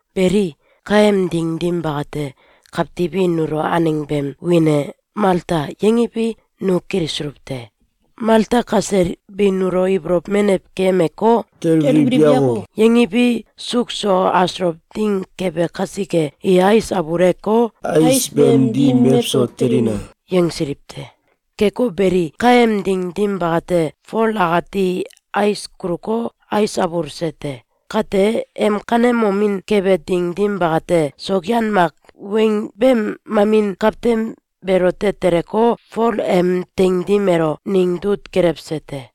Beli, kaem ding dim bakate, kawtiw i nulo aneng beem wiin e “Malta!”, yangiwi, nu kilisuluw te. Malta kasel bi nulo ibolow menew keyemeko, “Talbiliw yako!”, yangiwi, suuk so asolow ding kebe kasike, i ais abuleko, “Ais beem dim mewso telina!”, yangsiliw te. Keko beli, kaem ding dim bakate, Fol akati ais kuluko, ais abulse te. Kate, em kanemomin kebe ding dim bakate, sokyan mak weing beem mamin kawtem beelote teleko, Fol em teing dim elo ning dut kelewse te.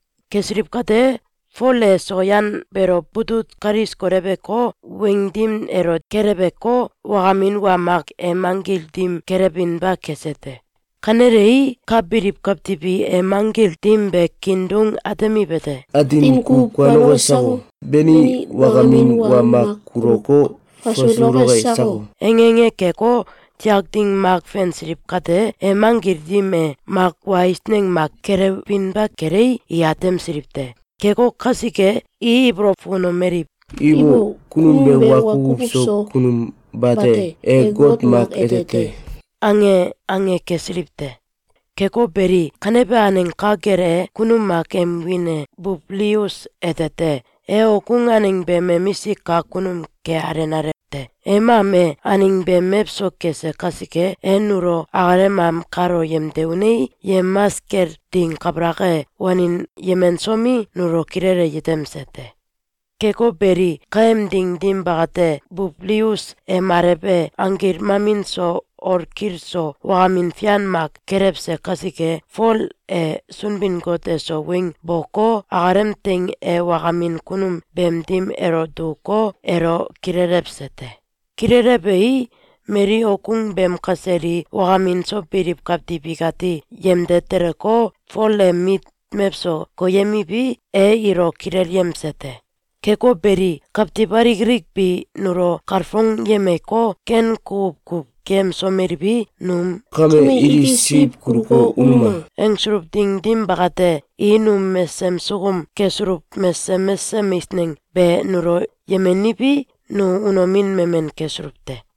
Kesiliw kate, Fol e sokyan beelo butut kalis koleweko, weing dim elo keleweko, wakamin wa mak em anggil dim kelewinba kese te. Kanelei, ka biliw kawtiw i em anggil dim be kiin doung atemiwete: “Atin kuw kuanoke sako? Bani, wakamin wa mak kuluko, fasuloke sako?”, ange ange keko, tiak ding mak fensiliw kate, em anggil dim e mak wa eisneng mak kelewinba kelei, i atemsiliw te. Keko kasike, i ibolow fukunomeliw: “Ibo! Kunum be wa kukuw so kunum bate! E got mak ete te!”, ange amge kesiliw te. Keko beli, kanebe aneng ka kel e, kunum mak em wiin e Buwlius ete te. E okgung aneng beem emisik kak kunum ke alenale te. Em am e aneng beem mewso kese kasike, e nulo akalem am kalo yemde unei, yemamas kel ding kabalak e, wanin yemensomi, nulo kilele yetemse te. Keko beli, kaem ding dim bakate, Buwlius em alew e anggil mamin so ol kil so wakamin fian mak kelewse kasike, Fol e Sunbin-Got eso weng bokoko, akalem teing e wakamin kunum beem dim elo dukuko, elo kilelewse te. Kilelewei, mali okgung beem kasel i wakamin so biliw kawtiw ikati yemde teleko, Fol em mit mewso koyemiwi, e ilo kilelyemse te. Keko beli, kawtiw alik alik bi nulo kalfongyemeko, ken kukuw kuw keyemsomeliwi, num “Kame iti siw kuluko, unuma!”, angsuluw ding dim bakate, i num mesesem sukum kesuluw mesesem mesesem eisneng be nulo yemeniwi, nu unomin memen kesuluw te.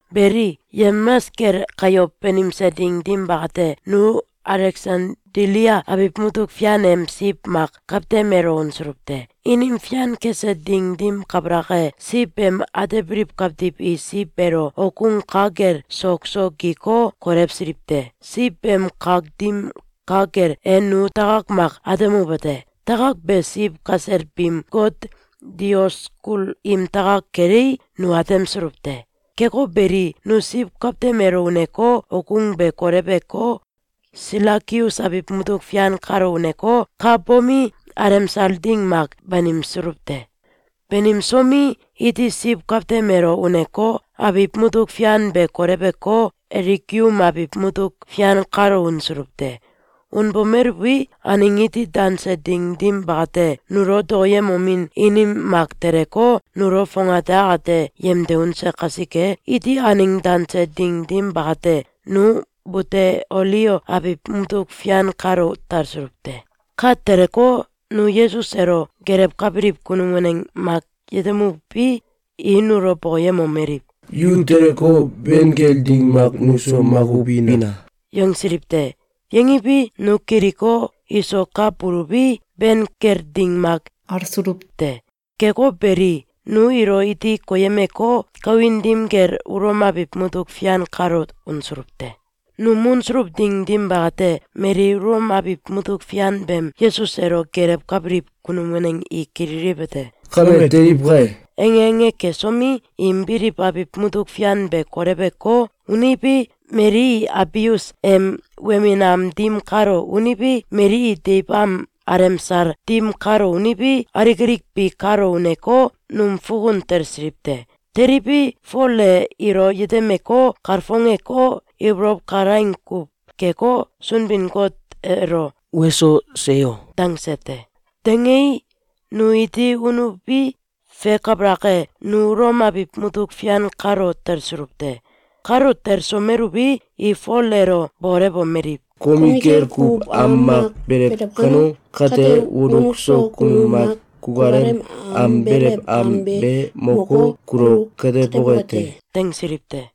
Beli, yemamas kel kayow banimse ding dim bakate, nu Aleksandilia abiw mutuk fian em siw mak kawtem elo unsuluw te. Inim fian kese ding dim kabalak e, siw beem atebiliw kawtiw i siw beelo okgung ka kel sok so giko, kolewsiliw te. Siw beem kak dim ka kel e nu takak mak atemuwete: Takak be siw kasel biim got Dioskul im takak kelei, nu atemsuluw te. Keko beli, nu siw kawtem elo uneko, okgung be koleweko, Silakius abiw mutuk fian kalo uneko, ka bomi, alemsal ding mak banimsuluw te. Banimsomi, iti siw kawtem elo uneko, abiw mutuk fian be koleweko, Elegium abiw mutuk fian kalo unsuluw te. Unbomeluwi, aneng iti danse ding dim bakate, nulo dokoyemomin inim mak teleko, nulo fongate akate yemde unse kasike, iti aneng danse ding dim bakate, nu Buteoli abiw mutuk fian kalo talsuluw te. Ka teleko, nu Yesus elo gelewkabiliw kunum waneng mak yetemuwi, i nulo bokoyemomeliw: “Yu teleko, ben kel ding mak nuso makuw bina!”, yangsiliw te. Yangiwi, nu kiliko, iso ka buluwi, ben kel ding mak alsuluw te. Keko beli, nu ilo iti koyemeko, kawin dim kel Ulom abiw mutuk fian kalo unsuluw te. Num unsuluw ding dim bakate, mali Ulom abiw mutuk fian beem Yesus elo gelewkabiliw kunum waneng i kililiwete: “Kame teliw kai!”, ange ange kesomi, im biliw abiw mutuk fian be koleweko, uniwi, mali i Abius em Wemin Am dim kalo uniwi, mali i Deiw Am Alemsal dim kalo uniwi, alik alik bi kalo uneko, num fukun talsiliw te. Teliwi, Fol e ilo yetemeko, kalfongeko, ibolow kalaing kuw keko, Sunbin-Got elo “Weso, seyo!”, dangse te. Dangei, nu iti unuwi, fe kabalak e, nu Ulom abiw mutuk fian kalo talsuluw te. Kalo telesomeluwi, i Fol elo bokolewomeliw: “Komikel kuw am mak belew kano, kate, wonuk so kunum mak kukalem am belew am be moko, kulo kateboke te.”, dangsiliw te.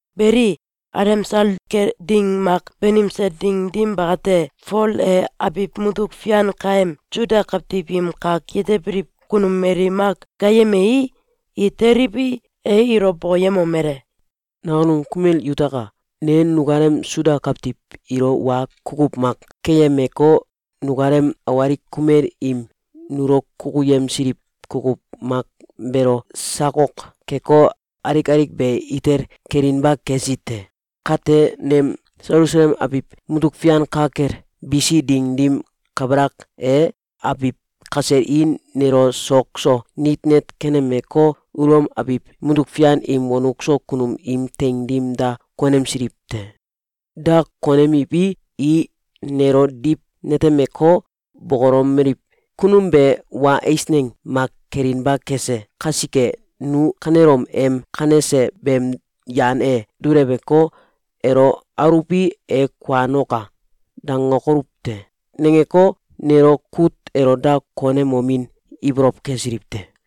Beli, alemsal kel ding mak banimse ding dim bakate, Fol e abiw mutuk fian kaem Suda kawtiw im kak yetebiliw kunum mali mak gaayemei, i teliwi, e ilo bokoyemomele: “Nakunum kumel yutaka! Ne nukalem Suda kawtiw ilo wa kukuw mak keyemeko, nukalem awalik kumel im nulo kukuyemsiliw kukuw mak beelo sakok keko, alik alik be itel kelinba kesi te. Kate, nem Selusalem abiw mutuk fian ka kel bisi ding dim kabalak e, abiw kasel i nelo sok so nit net kenemeko, Ulom abiw mutuk fian im wonuk so kunum im teing dim da konemsiliw te. Da konemiwi, i nelo diw netemeko, bokolomeliw: ‘Kunum be wa eisneng mak kelinba kese kasike, nu kanelom em kanese beem yan e duleweko, ‘Elo aluwi, e kuanoka!’, dangokoluw te!’, nangeko, nelo kut elo da konemomin ibolow kesiliw te.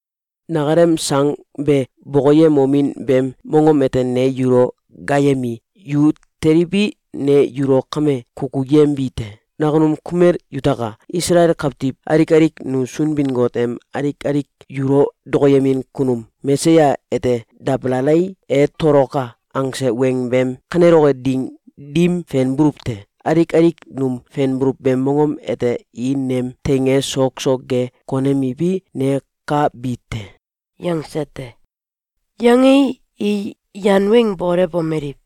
Nakalem sang be bokoyemomin beem mongom ete ne yulo gaayemii, yu teliwi, ne yulo kame kukuyembi te. Nakunum kumel yutaka! Isalael kawtiw alik alik nu Sunbin-Got em ‘Alik alik yulo dokoyemin kunum Mesaya ete dabalalii, e toloka!’, angse weng beem kaneloke ding dim fenbuluw te. Alik alik num fenbuluw beem mongom ete i nem teing e sok so ge konemiwi, ne ka bi te.”, yangse te. Yangei, i yan weng bokolewomeliw: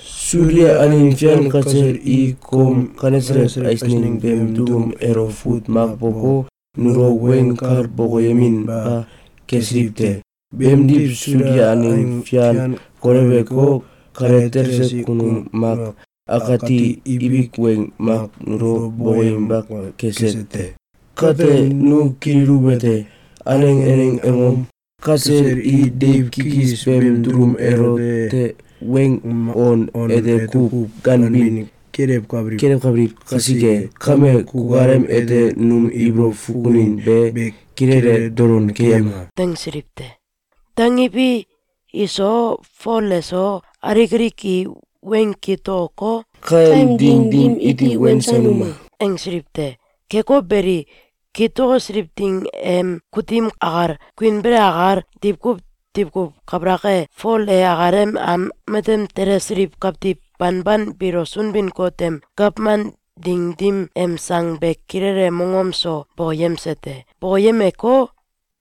“Sudia aneng fian kasel i kom kaneselew eisneng beem dulum elo fut mak boko, nulo weng kal bokoyeminba kesiliw te. Beemdiw, Sudia aneng fian koleweko, kale telese kunum mak akati ibik weng mak nulo bokoyeminba kese te. Kate, nu kililuwete: Aneng aneng angom kasel i deiw kikis beem dulum elote weng on ete kuw ganbin kelewkabiliw kasike kame, kukalem ete num ibolow fukunin be kilele dolon keyema!”, dangsiliw te. Dangiwi, iso, Fol eso, alik alik i weng kitokoko, “Kaem ding dim iti wensanuma!”, angsiliw te. Keko beli, kitokosiliw ding em kutim akal, kuinbele akal, diwkuw diwkuw kabalak e, Fol e akalem am matem telesiliw kawtiw banban biilo Sunbin-Got em gawman ding dim em sang be kilele mongom so bokoyemse te. Bokoyemeko,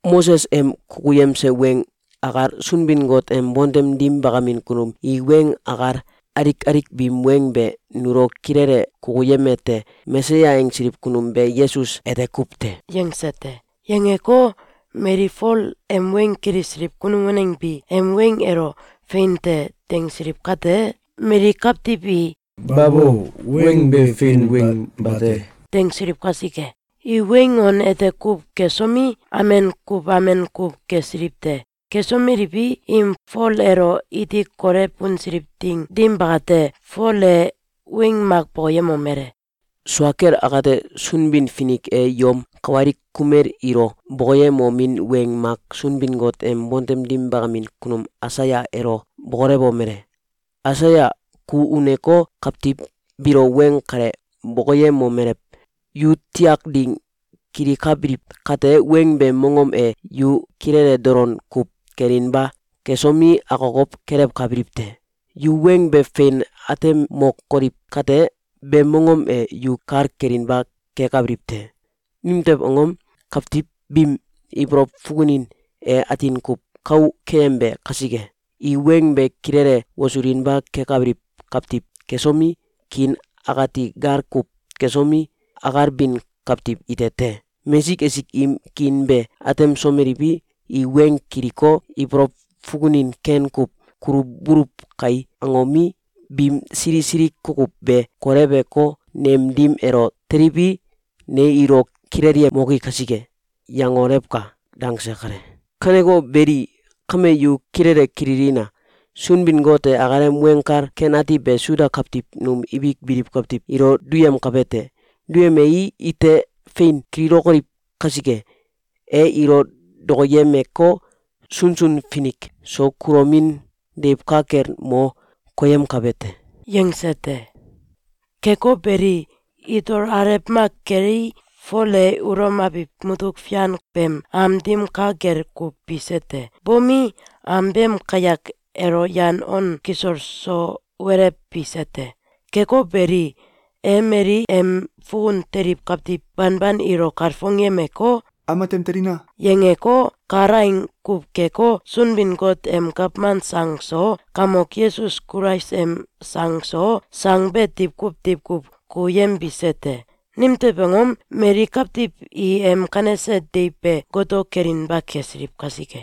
“Moses em kukuyemse weng akal, Sunbin-Got em bontem dim bakamin kunum im weng akal, alik alik biim weng be nulo kilele kukuyemete: Mesaya angsiliw kunum be Yesus ete kuw te.”, yangse te. Yangeko, mali Fol em weng kilisiliw kunum waneng bi em weng elo “Fein te!”, dangsiliw kate, mali kawtiw i “Babo! Weng be fein weng bate!”, dangsiliw kasike, i weng on ete kuw kesomi, amen kuw amen kuw kesiliw te. Kesomeliwi, im Fol elo iti kolew unsiliw ding dim bakate, Fol e weng mak bokoyemomele: “Sua kel akate, Sunbin-Finik e yom kawalik kumel ilo bokoyemomin weng mak Sunbin-Got em bontem dim bakamin kunum Aisaya elo bokolewomele: ‘Aisaya, ku uneko, kawtiw biilo weng kale bokoyemomelew: ‘Yu tiak ding kilikabiliw kate, weng beem mongom e yu kilele dolon kuw kelinba kesomi, akokow kelewkabiliw te. Yu weng be fein atemokoliw kate, beem mongom e yu kal kelinba kekabiliw te. Nimtew angom? Kawtiw biim ibolow fukunin e atin kuw kou keyembe kasike. I weng be kilele wosulinba kekabiliw kawtiw kesomi, kiin akati gal kuw kesomi, akalbin kawtiw ite te. Mesik esik im kiin be atemsomeliwi, i weng kiliko, ‘Ibolow fukunin ken kuw kulubuluw kai!’, angomi, biim sili sili kukuw be koleweko, nem dim elo teliwi, ne ilo kilelyemoki kasike.’, yangolewka!’, dangse kale. Kaneko beli, kame yu kilele kililina! Sunbin-Got e akalem Weng kal Ken Ati be Suda kawtiw num ibik biliw kawtiw ilo duyemkabe te. Duyemei, ite fein kililokoliw kasike, e ilo dokoyemeko, sunsun dinik so kulomin deiw ka kel mo koyemkabe te.”, yangse te. Keko beli, itol alew mak kelei, Fol e Ulom abiw mutuk fian beem am dim ka kel kuw bise te. Bomi, am beem kayak elo yan on kisol so welewbise te. Keko beli, e mali em fukun teliw kawtiw banban ilo kalfongyemeko, “Am matem telina!”, yangeko, kalaing kuw keko, Sunbin-Got em gawman sang so, Kamok Yesus Kulais em sang so, sang be diwkuw diwkuw kukuyembise te. Nimtew angom? Mali kawtiw i em kanese deiw be goto kelinba kesiliw kasike.